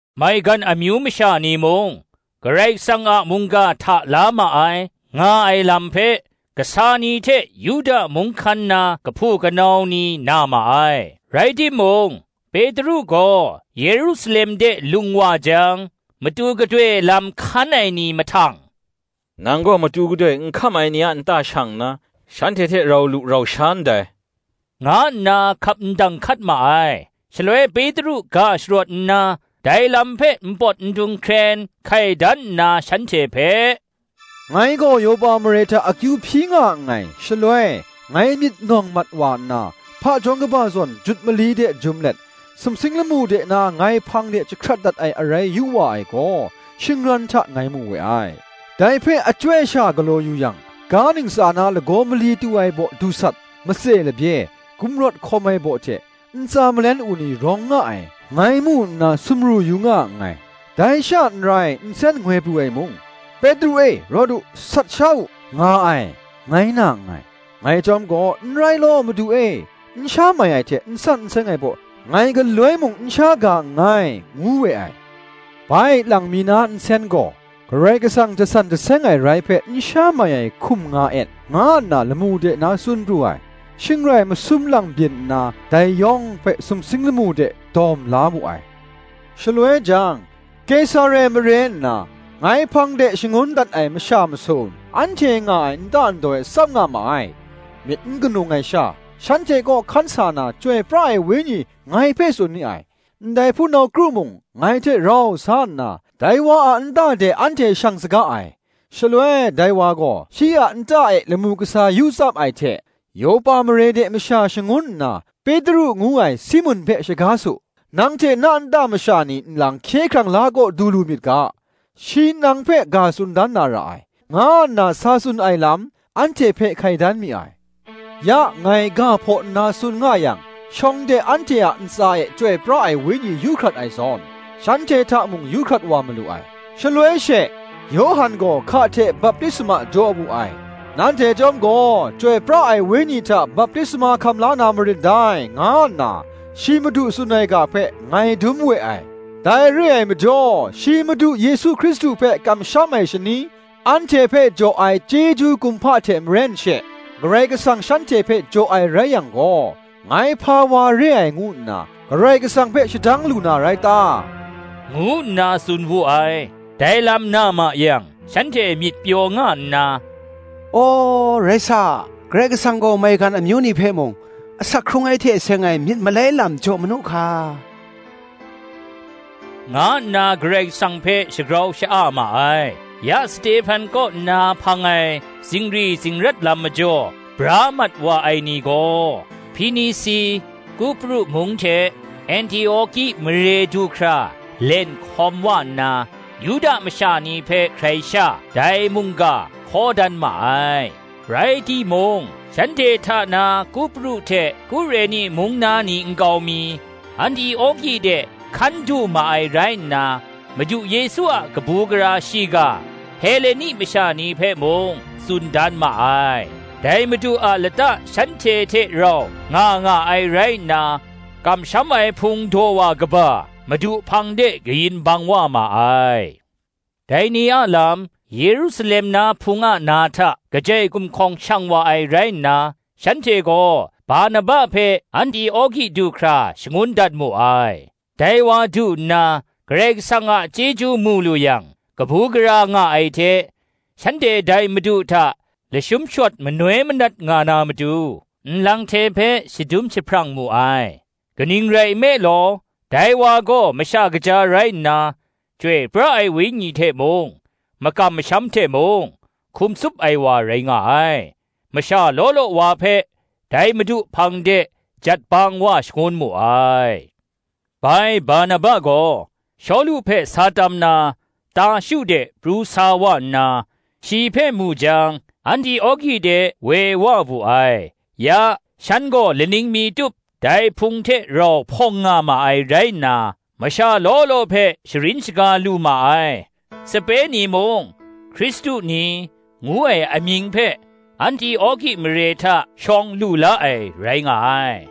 Maigan amyu masha ni mung, Karai Kasang a mungga hta la ma ai, nga ai lam hpe kasa ni hte Yuda mung hkan na kahpu kanau ni na ma ai. Rai timung, Petru gaw Yerusalem de lung wa jang matu gadoi lam hkan ai ni mahtang, “Nang gaw matu gadoi n hkam ai ni a nta shang nna, shanhte hte rau lu rau sha ndai,” nga nna hkap ndang hkat ma ai. shaloi Petru ga sharawt nna, dai lam hpe npawt ndung hkren hkai dan nna shanhte hpe, “Ngai gaw Yopa mare hta akyu hpyi nga nngai; shaloi ngai myit nawng mat wa nna, hpajawng kaba zawn jut mali de jum let, sumsing lamu de na ngai hpang de jahkrat dat ai arai yu wa ai gaw, shingran hta ngai mu we ai: dai hpe achyoi sha galaw yu yang, ga ntsa na lagaw mali tu ai baw dusat, matse labye, gumrawt hkawm ai baw hte, ntsa malen u ni rawng nga ai, ngai mu nna sumru yu nga nngai. Dai sha n rai, nsen ngoi pru ai mung, ‘Petru e, rawt u; sat sha u,’ nga ai, ngai na nngai. Ngai chyawm gaw, ‘N rai law, Madu e; n sha mai ai hte n san n seng ai baw, ngai galoi mung n sha ga nngai,’ ngu we ai. Bai lang mi na nsen gaw, ‘Karai Kasang jasan jaseng ai rai hpe n sha mai ai hkum nga et,’ nga nna lamu de na tsun pru ai. shing rai masum lang byin nna, dai yawng hpe sumsing lamu de dawm la wu ai. Shaloi jang, Kesare mare nna, ngai hpang de shangun dat ai masha masum, anhte nga ai nta ndaw e tsap nga ma ai. Myit n ganung ai sha, shanhte kaw hkan sa na, Chyoi pra ai Wenyi ngai hpe tsun ni ai; ndai hpunau kru mung ngai hte rau sa nna, dai wa a nta de anhte shang saga ai. Shaloi dai wa gaw, shi a nta e lamu kasa yu tsap ai hte, Yopa mare de masha shangun nna, Petru ngu ai Simun hpe shaga su; nang hte na nta masha ni nlang hkye hkrang la kaw du lu myit ga, shi nang hpe ga tsun dan na ra ai, nga nna sa tsun ai lam, anhte hpe hkai dan mi ai. Ya, ngai ga hpaw nna tsun nga yang, shawng de anhte a ntsa e Chyoi pra ai Wenyi yu hkrat ai zawn, shanhte hta mung yu hkrat wa malu ai. Shaloi she, Yawhan gaw hka hte baptisma jaw wu ai; nanhte chyawm gaw, Chyoi pra ai Wenyi hta baptisma hkam la na marin dai, nga nna, shi Madu tsun ai ga hpe ngai dum we ai. Dai re ai majaw, shi madu Yesu Hkristu hpe kamsham ai shani, anhte hpe jaw ai chyeju kumhpa hte maren she, Karai Kasang shanhte hpe jaw ai rai yang gaw, ngai hpa wa re ai ngu nna, Karai Kasang hpe shadang lu na rai ta?” ngu nna tsun wu ai. Dai lam na ma yang, shanhte myit pyaw nga nna, “Aw, rai sa, Karai Kasang gaw maigan amyu ni hpe mung, asak hkrung ai hte seng ai myit malai lam jaw manu hka,” nga nna Karai Kasang hpe shagrau sha-a ma ai. Ya Stehpan kaw nna hpang ai zingri zingrat lam majaw bra mat wa ai ni gaw, Hpinisi, Kupru mung hte Antioki mare du hkra len hkawm wa nna, Yuda masha ni hpe hkrai sha, dai mungga hkaw dan ma ai. Rai timung, shanhte hta na Kupru hte Kureni mung na ni nkau mi, Antioki de hkan du ma ai rai nna, Madu Yesu a kabu gara shiga, Heleni masha ni hpe mung tsun dan ma ai. Dai Madu a lata shanhte hte rau nga nga ai rai nna, kamsham ai hpung daw wa kaba, Madu hpang de kayin bang wa ma ai. Dai ni a lam, Yerusalem na Hpung a na hta kajai gumhkawng shang wa ai rai nna, shanhte gaw Barnaba hpe Antioki du hkra shangun dat mu ai. Dai wa du nna, Karai Kasang a chyeju mu lu yang, kabu gara nga ai hte, shanhte dai Madu hta lashum shawt manoi manat nga na matu, nlang hte hpe shadum jahprang mu ai: kaning rai nme law, dai wa gaw masha kaja rai nna, Chyoi pra ai Wenyi hte mung, makam masham hte mung, hkum tsup ai wa rai nga ai: masha law law wa hpe dai Madu hpang de jat bang wa shangun mu ai. Bai Barnaba gaw, Shawlu hpe sa tam na Tarshu de pru sa wa nna, shi hpe mu jang Antioki de woi wa wu ai. Ya, shan gaw laning mi tup dai Hpung hte rau hpawng nga ma ai rai nna, masha law law hpe sharin shaga lu ma ai; sape ni mung, Hkristu ni, ngu ai amying hpe, Antioki mare hta shawng lu la ai rai nga ai.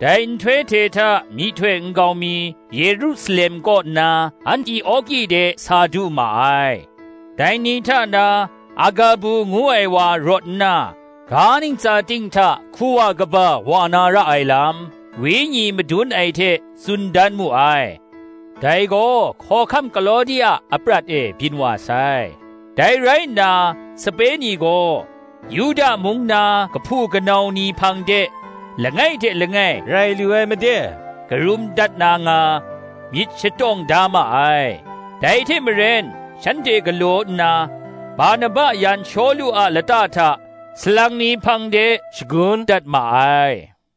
Dai nhtoi hte hta myihtoi nkau mi Yerusalem kaw nna, Antioki de sa du ma ai. Dai ni hta na Agabu ngu ai wa rawt nna, ga ntsa ting hta hku wa kaba wa na ra ai lam, Wenyi madun ai hte tsun dan mu ai; dai gaw hkawhkam Klawdi a aprat e byin wa sai. Dai rai nna, sape ni gaw, Yuda mung na kahpu kanau ni hpang de langai hte langai rai lu ai made karum dat na nga, myit shatawng da ma ai: dai hte maren shanhte galaw nna, Barnaba yan Shawlu a lata hta salang ni hpang de shagun dat ma ai.